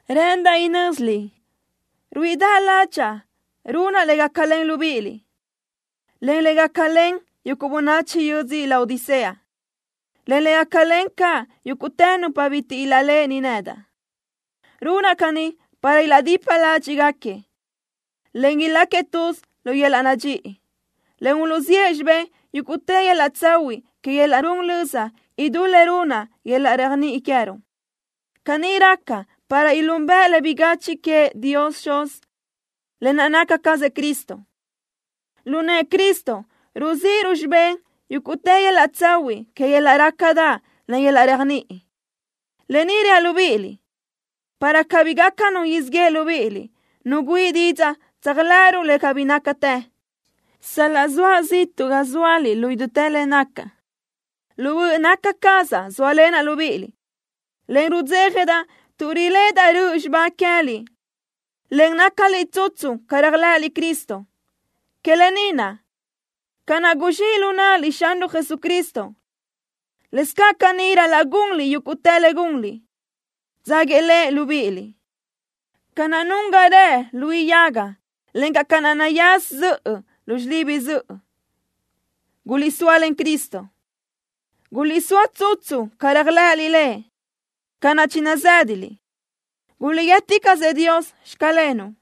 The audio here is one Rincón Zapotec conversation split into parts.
Rë́ʼëndaʼ inö́ziliʼ ruíʼidaʼ ládxaʼa runaʼ le gácalen libíʼiliʼ, encaʼ le gácalen bönachi yödzö Laodicea, en le gácalen caʼ yúguʼtë nupa bitiʼ ilaʼléʼeni nedaʼ. Runaʼ caní para ilaʼdipa ládxiʼgaquiëʼ, en iláquiëʼ tuz lu yöl-laʼ nadxíʼi, en uluʼziʼë xibé yúguʼtë yöl-laʼ tsahuiʼ que yöl-laʼ run löza idú le runna yöl-laʼ réajniʼi queë́ruʼ. Caní raca para ilúnbëʼë le bigachiʼ queëʼ Dios Xuz, lë naʼ naca cazëʼ Cristo. Lu nëʼë Cristo ruzíʼiruʼ xibé yúguʼtë yöl-laʼ tsahuiʼ que yöl-laʼ rácadaʼ, en yöl-laʼ réajniʼi. Lë ni reaʼ libíʼiliʼ, para cabí gaca nu siʼ yeʼe libíʼiliʼ, nu güíʼi didzaʼ tséajlëʼëruʼ le cabí nácatë. Sal-laʼ zoaʼ ziʼtuʼ ga zóaliʼ lu idútë le nacaʼ, lu böʼ naca cazaʼ zóalenaʼ libíʼiliʼ, en rudzéjadaʼ tuʼ riléʼedaʼ röʼö xibá queë́liʼ, en nácaliʼ tsutsu ca réajlëʼëliʼ Cristo. Que lë ni naʼ, ca naʼ guzxíʼ lu náʼaliʼ Xanruʼ Jesucristo, lëscaʼ caní ral-laʼ gunliʼ yúguʼtë le gunliʼ, dzáguiëʼ Lëʼ libíʼiliʼ. Ca naʼ nun ga rëʼ luí yaga, encaʼ ca naʼ nayás zöʼö lu xilibi zöʼö, guliʼsóalen Cristo. Guliʼsóa tsutsu ca réajlëʼëliʼ Lëʼ, ca naʼ chinazë́daliʼ. Guliʼguíëticaʼsëʼ Dios: “Xclenuʼ.”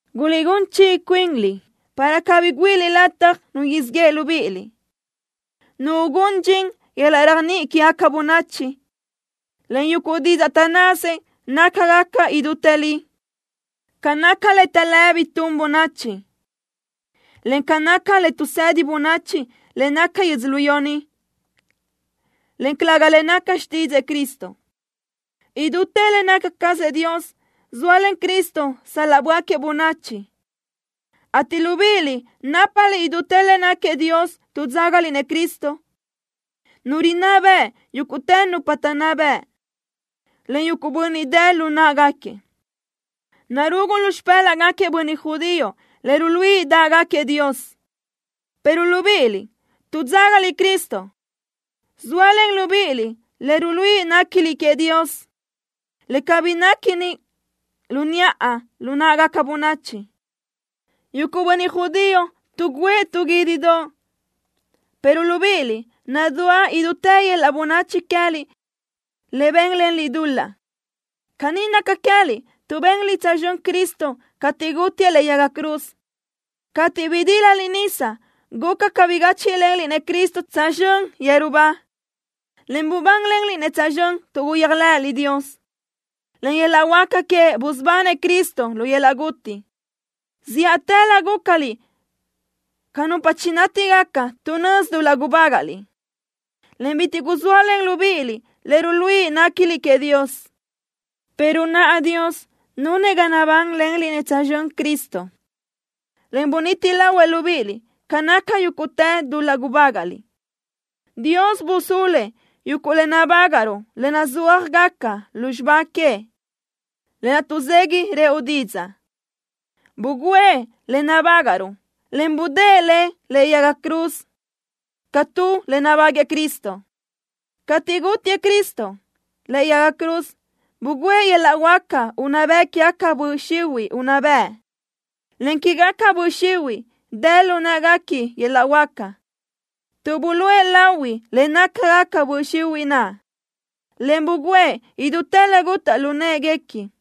Guliʼgún chiʼi cuinliʼ para cabí güíʼiliʼ lataj nu siʼ yeʼe libíʼiliʼ, nu ugún dxin yöl-laʼ réajniʼi quégaca bönachi, en yuguʼ didzaʼ taʼnnasëʼ nácagaca idútë li, ca naca le taʼlë́bi tun bönachi, en ca naca le tuʼsedi bönachi le naca que yödzölió ni, en calëga le naca xtídzëʼë Cristo. Idútë le naca cazëʼ Dios zóalen Cristo sal-laʼ böáquiëʼ bönachi, ateʼ libíʼiliʼ nápaliʼ idútë le náquiëʼ Dios tuʼ dzágaliʼ-nëʼ Cristo, Nu rinná beʼe yúguʼtë nupa taʼnná bëʼ, en yuguʼ bönniʼ dë lu náʼagaquiëʼ. Narugu lu xipë́laʼgaquiëʼ bönniʼ judío le ruluíʼi dáʼgaquiëʼ Dios, pero libíʼiliʼ, tuʼ dzágaliʼ Cristo, zóalen libíʼiliʼ le ruluíʼi néquiliʼ queëʼ Dios, le cabí néquini lu niʼa lu náʼagaca bönachi. Yuguʼ bönniʼ judío tuʼgǘëʼ tu guídidoʼ, pero libíʼiliʼ, nadúa idútë yöl-laʼ bönachi queë́liʼ le bénlenliʼ dul-laʼ. Caní naca queë́liʼ tuʼ benliʼ tsözxö́n Cristo cateʼ gútiëʼ lëʼe yaga cruz. Cateʼ bidílaliʼ nisa guca ca bigáchiʼlenliʼ-nëʼ Cristo tsözxö́n yeru ba, en bubánlenliʼ-nëʼ tsözxö́n tuʼ guyéajlëʼëliʼ Dios, len yöl-laʼ huáca queëʼ busubanëʼ Cristo lu yöl-laʼ guti. Zíʼatëlö gúcaliʼ ca nupa chinátigaca tuʼ nözi dul-laʼ gubágaʼliʼ, en bitiʼ guzóalen libíʼiliʼ le ruluíʼi néquiliʼ queëʼ Dios, pero naʼa Dios nunëʼ ga nabánlenliʼ-nëʼ tsözxö́n Cristo, en buniti lahuëʼ libíʼiliʼ ca naca yúguʼtë dul-laʼ gubágaʼliʼ. Dios busúluëʼ yuguʼ le nabágaʼruʼ le nazúajgaca lu xibá queëʼ, lë naʼ tuʼzegui rëʼu didzaʼ. Bugǘëʼ lë naʼ nabágaʼruʼ, en budë́ʼë le lëʼe yaga cruz ca tu le nabáguëʼë Cristo. Cateʼ gútiëʼ Cristo lëʼe yaga cruz, bugǘëʼ yöl-laʼ huáca unná bëʼ quégaca böʼ xihuiʼ unná bëʼ, en quégaca böʼ xihuiʼ dë lu në́ʼeguequi yöl-laʼ huáca, tuʼ buluʼe lahui le nácagaca böʼ xihuiʼ naʼ, en bugǘëʼ idutë le gutaʼ lu në́ʼeguequi.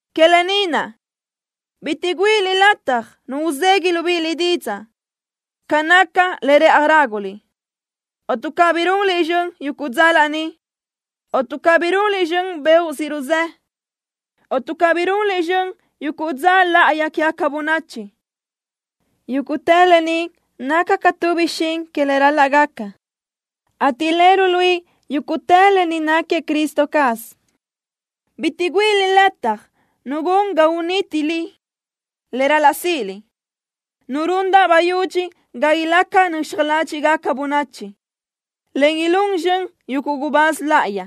Que lë ni naʼ, bitiʼ güíʼiliʼ lataj nu uzegui libíʼiliʼ didzaʼ ca naca le rëʼaj ráguliʼ, o tuʼ cabí runliʼ zxön yuguʼ dza laní, o tuʼ cabí runliʼ zxön beoʼ siʼ ruzë́, o tuʼ cabí runliʼ zxön yuguʼ dza láʼayi quégaca bönachi. Yúguʼtë lë ni naca ca tu bixín que le ral-laʼ gaca, ateʼ le ruluíʼi yúguʼtë lë ni náquiëʼ Cristo caz. Bitiʼ güíʼiliʼ lataj nu gun ga unítiliʼ le ral-laʼ síʼiliʼ, nu rundaʼ bayudxi ga ilaca nöxaj ládxiʼgaca bönachi, en ilún zxön yuguʼ gubáz láʼayi.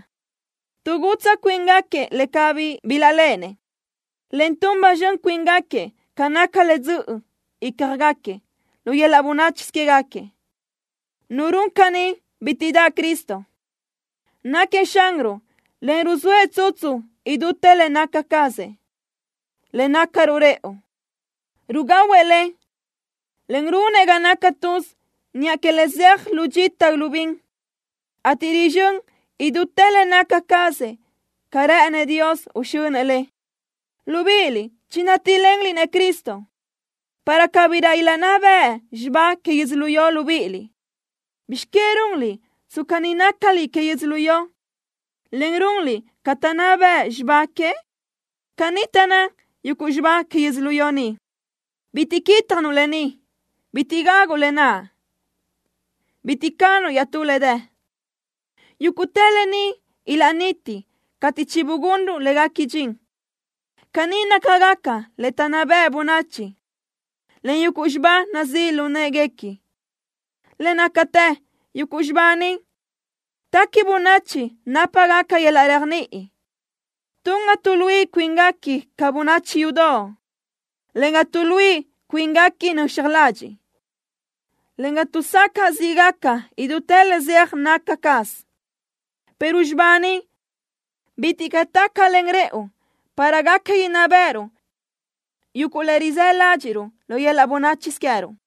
Tuʼgutsaʼ cuíngaquiëʼ le cabí bilaʼléʼenëʼ, en tun ba zxön cuíngaquiëʼ ca naca le dzö́ʼösö ícjagaquiëʼ lu yöl-laʼ bönáchisö quégaquiëʼ. Nu run caní bitiʼ daʼ Cristo. Náquiëʼ Xanruʼ, en ruzóëʼ tsutsu idútë le naca cazëʼ, le nácaruʼ rëʼu. Rugahuëʼ le, en runëʼ ga naca tuz niʼa que le zeaj lu dxita lu bin, ateʼ rizxö́n idútë le naca cazëʼ ca rë́ʼënëʼ Dios uxönëʼ le. Libíʼiliʼ chinátilenliʼ-nëʼ Cristo para cabirö ilaʼnná beʼe xibá que yödzölió libíʼiliʼ. ¿Bizx que runliʼ tsca ni nácaliʼ que yödzölió, en runliʼ ca taʼnná bëʼ xibá que? Caní taʼnná yuguʼ xibá que yödzölió ni: Bitiʼ quítjanuʼ lë ni. Bitiʼ gaguʼ lë naʼ. Bitiʼ canuʼ iaʼtú le dë. Yúguʼtë lë ni ilaʼniti cateʼ chibugunruʼ léguequi dxin. Caní nácagaca le taʼnná bëʼ bönachi, en yuguʼ xibá nazíʼ lu në́ʼeguequi. Le nácatë, yuguʼ xibá ni, téqui bönachi nápagaca yöl-laʼ réajniʼi. Tun ga tuʼluíʼi cuínguequi ca bönachi yudoʼ, en ga tuʼluíʼi cuínguequi nöxaj ladxiʼ, en ga tuʼsacaʼ zíʼgaca idútë le zeaj naca caz, pero xibá ni bitiʼ caʼ tácalen rëʼu para gaca inná béʼeruʼ yuguʼ le rizë́ ládxiʼruʼ lu yöl-laʼ bönáchisö queë́ruʼ.